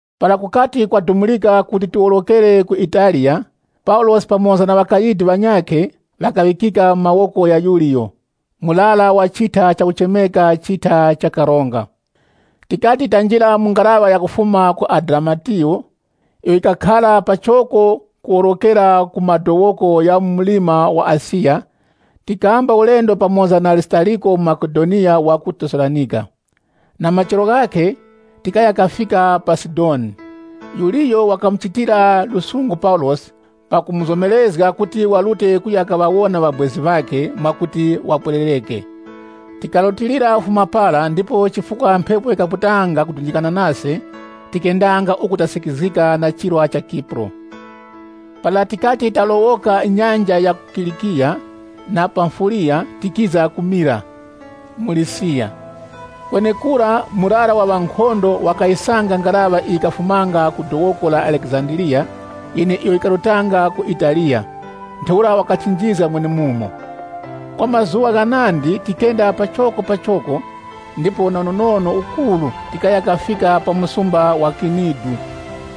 Para kukati kwadumurika kuti tilowokere ku Italiya, Paulosi pamoza na ŵakayidi ŵanyakhe, ŵakaŵikika mu mawoko gha Yuliyo, murara wa chitha chakuchemeka chitha cha karonga. Tikati tanjira mu ngaraŵa yakufuma ku Adiramitiyo, iyo yikakhara pachoko ku lowokera ku madowoko gha mu mlima wa Asiya, tikamba ulendo pamoza na Arisitariko muMakedoniya wa ku Tesalonika. Na machero ghakhe, tikaya kafika pa Sidoni. Yuliyo wakamuchitira lusungu Paulosi, pakumuzomerezga kuti warute kuya kaŵawona ŵabwezi ŵakhe, mwakuti wapwererereke. Tikarutilira kufuma para, ndipo chifukwa mphepo yikaputanga kudunjikana nase, tikenda uku tikasikizgikanga na chirwa cha Kipuro. Para tikati talowoka nyanja ya ku Kilikiya na Pamfiliya tikiza ku Mira, mu Lisiya. Kwenekura murara wa ŵankhondo, wakayisanga ngaraŵa iyo yikafumanga ku dowoko la Alekizandiriya, yeneiyo yikarutanga ku Italiya, ntheura wakatinjizga mwenemumo. Kwa mazuŵa ghanandi tikenda pachokopachoko ndipo na unonono ukuru tikaya kafika pa msumba wa Kinidu.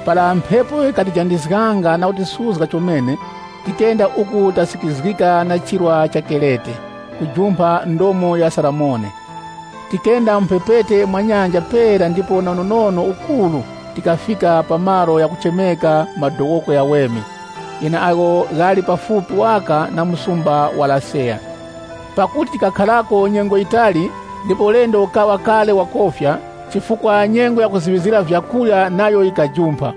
Para mphepo yikatijandizganga na kutisuzga chomene, tikenda uku tasikizgika na chirwa cha Kerete, kujumpha ndomo ya Salimone. Tikenda mu mphepete mwa nyanja pera ndipo na unonono ukuru tikafika pa malo ghakuchemeka Madowoko Ghaweme, gheneagho ghali pafupi waka na msumba wa Laseya. Pakuti tikakharako nyengo yitali ndipo ulendo ukaŵa kale wakofya, chifukwa nyengo ya kuziŵizgira vyakurya nayo yikajumpha,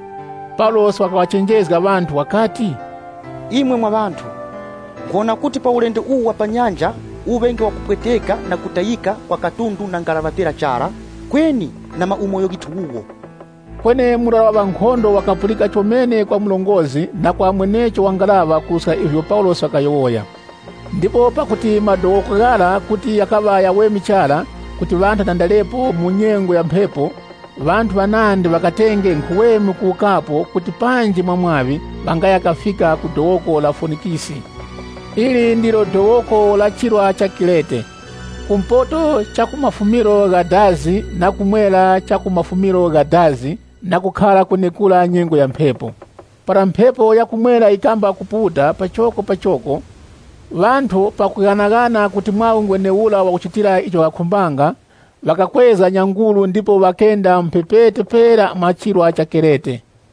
Paulosi wakaŵachenjezga ŵanthu wakati, “Imwe mwa ŵanthu, nkhuwona kuti pa ulendo uwu wa pa nyanja uŵenge wakupweteka na kutayika kwa katundu na ngaraŵa pera chara, kweni na maumoyo ghithu wuwo.” Kweni murara wa ŵankhondo wakapulikira chomene kwa murongozgi na kwa mwenecho wa ngaraŵa kuruska ivyo Paulosi wakayowoya. Ndipo pakuti madowoko ghara kuti ghakaŵa ghaweme chara kuti ŵanthu ŵatandarepo mu nyengo ya mphepo, ŵanthu ŵanandi ŵakatenge nkhuweme kuwukapo kuti panji mwa mwaŵi ŵangaya kafika ku dowoko la Fonikisi. Ili ndilo dowoko la chirwa cha Kerete, ku mpoto cha ku mafumiro gha dazi na ku mwera cha ku mafumiro gha dazi na kukhara kwenekura nyengo ya mphepo. Para mphepo ya ku mwera yikamba kuputa pachokopachoko, ŵanthu pakughanaghana kuti mwaŵi ngwenewura wakuchitira icho ŵakakhumbanga, ŵakakwezga nyanguru ndipo ŵakenda mu mphepete pera mwa chirwa cha Kerete.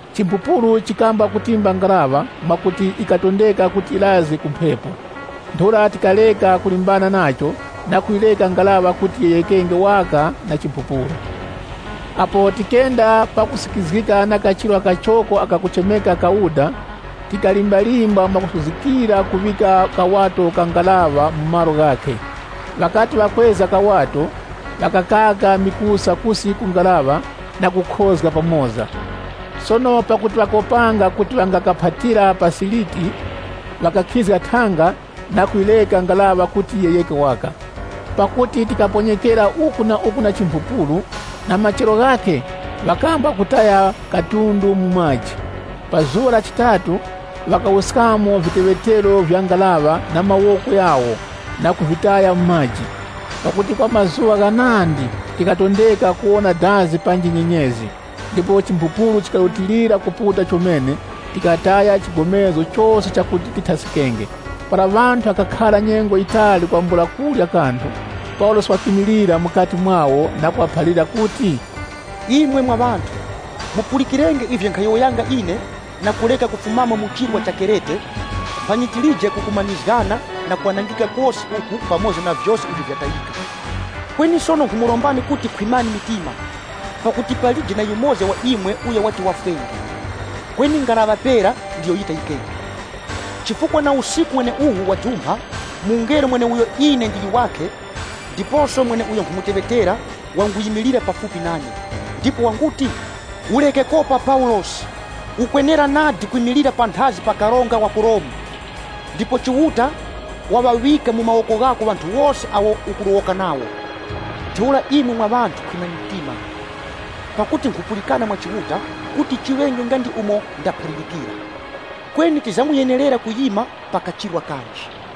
Chimphupuru chikamba kutimba ngaraŵa, mwakuti yikatondeka kuti yirazge ku mphepo. Ntheura tikareka kulimbana nacho na kuyireka ngaraŵa kuti yiyeghekenge waka na chimphupuru. Apo tikenda pakusikizgika na kachirwa kachoko ako kakuchemeka Kauda, tikalimbalimba mwakusuzgikira kuŵika kawato ka ngaraŵa mu malo ghakhe. Ŵakati ŵakakwezga kawato kara, ŵakakaka vingwe kusi ku ngaraŵa na kukhozga pamoza. Sono pakuti ŵakopanga kuti ŵangakaphatira pa Siriti, ŵakakhizga thanga na kuyireka ngaraŵa kuti yiyegheke waka. Pakuti tikaponyekera uku na uku na chimphupuru, na machero ghakhe ŵakamba kutaya katundu mu maji. Pa zuŵa la chitatu, ŵakawuskamo viteŵetero vya ngaraŵa na mawoko ghawo na kuvitaya mu maji. Pakuti kwa mazuŵa ghanandi tikatondeka kuwona dazi panji nyenyezi, ndipo chimphupuru chikarutilira kuputa chomene, tikataya chigomezgo chose chakuti tithaskikenge. Para ŵanthu ŵakakhara nyengo yitali kwambula kurya kanthu, Paulosi wakimilira mukati mwawo na kuŵaphalira kuti, “Imwe mwa ŵanthu, mupulikirenge ivyo nkhayowoyanga ine, na kureka kufumamo mu chirwa cha Kerete, mphanyi tilije kukumanizgana na kwanangika kose uku pamoza na vyose ivyo vyatayika. Kweni sono nkhumurombani kuti khwimani mitima, pakuti palije na yumoza wa imwe uyo wati wafwenge, kweni ngaraŵa pera ndiyo yitayikenge. Chifukwa na usiku weneuwu wajumpha mungelo wa Chiuta uyo ine ndili wakhe ndiposo mweneuyo nkhumuteŵetera, wanguyimilira pafupi nane, ndipo wanguti, ‘Ureke kopa Paulosi, ukwenera nadi kwimilira panthazi pa karonga wa ku Romu. Ndipo Chiuta waŵaŵika mu mawoko ghako ŵanthu wose awo ukulowoka nawo.’ Ntheura imwe mwa ŵanthu khwimani mtima, pakuti nkhupulikana mwa Chiuta, kuti chiŵenge nga ndi umo ndaphalirikira. Kweni tizamuyenerera kuyima pa kachirwa kanji.”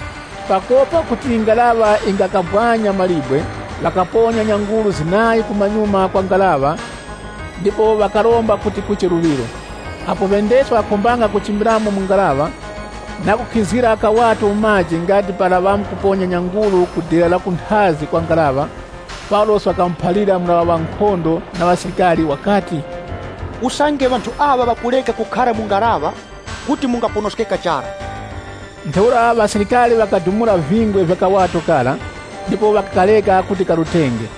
Pakopa kuti ngaraŵa yingakabwanya mawe, ŵakaponya nyanguru zinayi kumanyuma kwa ngaraŵa ndipo ŵakaromba kuti kuche luŵiro. Apo ŵendeski ŵakakhumbanga kuchimbiramo mu ngaraŵa, na kukhizgira kawato mu maji nga ndi para ŵamkuponya nyanguru ku dera la kunthazi kwa ngaraŵa, Paulosi wakamuphalira murara wa ŵankhondo na ŵasilikari wakati, “Usange ŵanthu aŵa ŵakureka kukhara mu ngaraŵa, kuti mungaponoskeka chara.” Ntheura ŵasilikari ŵakadumula vingwe vya kawato kara, ndipo ŵakakareka kuti karutenge.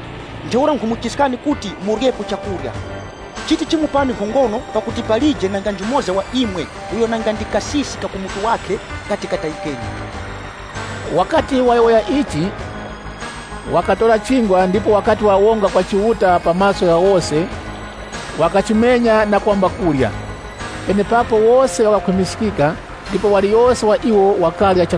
Ntheura nkhumuchiskani kuti muryepo chakurya. Chiti chimupani nkhongono pakuti palije nanga njumoza wa imwe uyo nanga ndi kasisi ka ku mutu wakhe kati katayikenge.” Wakati wayowoya ichi, wakatora chingwa ndipo wakati wawonga kwa Chiuta pa maso gha wose, wakachimenya na kwamba kurya. Penepapo wose ŵakakhwimiskika ndipo waliyose wa iwo wakarya.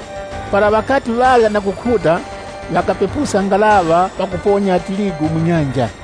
Para ŵakati ŵarya na kukhuta, ŵakapepuska ngaraŵa pakuponya tirigu mu nyanja.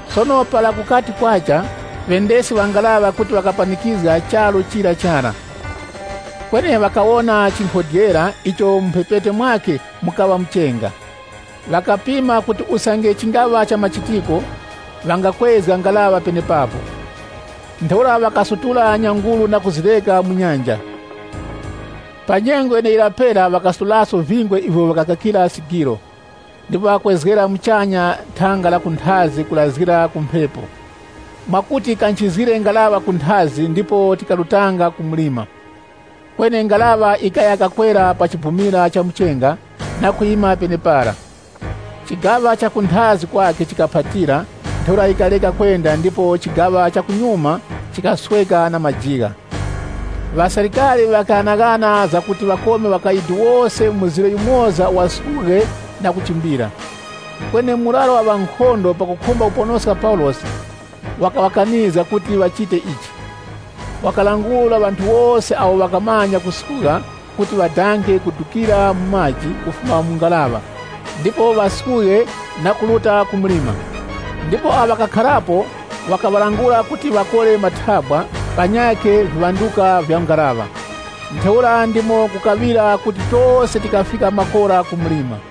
Sono para kukati kwacha, ŵendeski ŵa ngaraŵa kuti ŵakapanikizga charu chira chara, kweni ŵakawona chinkhodyera icho mu mphepete mwakhe mukaŵa muchenga. Ŵakapima kuti usange chingaŵa chamachitiko ŵangakwezga ngaraŵa penepapo. Ntheura ŵakasutula nyanguru na kuzireka mu nyanja. Pa nyengo yeneyira pera ŵakasutulaso vingwe ivyo ŵakakakira sigiro. Ndipo ŵakakwezga muchanya thanga la kunthazi kurazgira ku mphepo mwakuti yikanchizgire ngaraŵa kunthazi ndipo tikarutanga ku mlima. Kweni ngaraŵa yikaya kakwera mu chibumira cha muchenga, na kwima penepara. Chigaŵa cha kunthazi kwakhe chikaphatira, ntheura yikareka kwenda ndipo chigaŵa cha kumanyuma chikasweka na majigha. Ŵasilikari ŵakaghanaghana zakuti ŵakome ŵakayidi wose mzire yumoza waskughe na kuchimbira. Kweni murara wa ŵankhondo pakukhumba kuponoska Paulosi, wakaŵakanizga kuti wachite ichi. Wakalangula ŵanthu wose awo ŵakamanya kuskugha kuti ŵadanga ŵadukira mu maji kufuma mu ngaraŵa ndipo ŵaskughe na kuruta ku mlima. Ndipo awo ŵakakharapo, wakaŵalangula kuti ŵakore mathabwa, panyakhe viŵanduka vya ngaraŵa. Ntheura ndimo kukaŵira kuti tose tikafika makora ku mlima.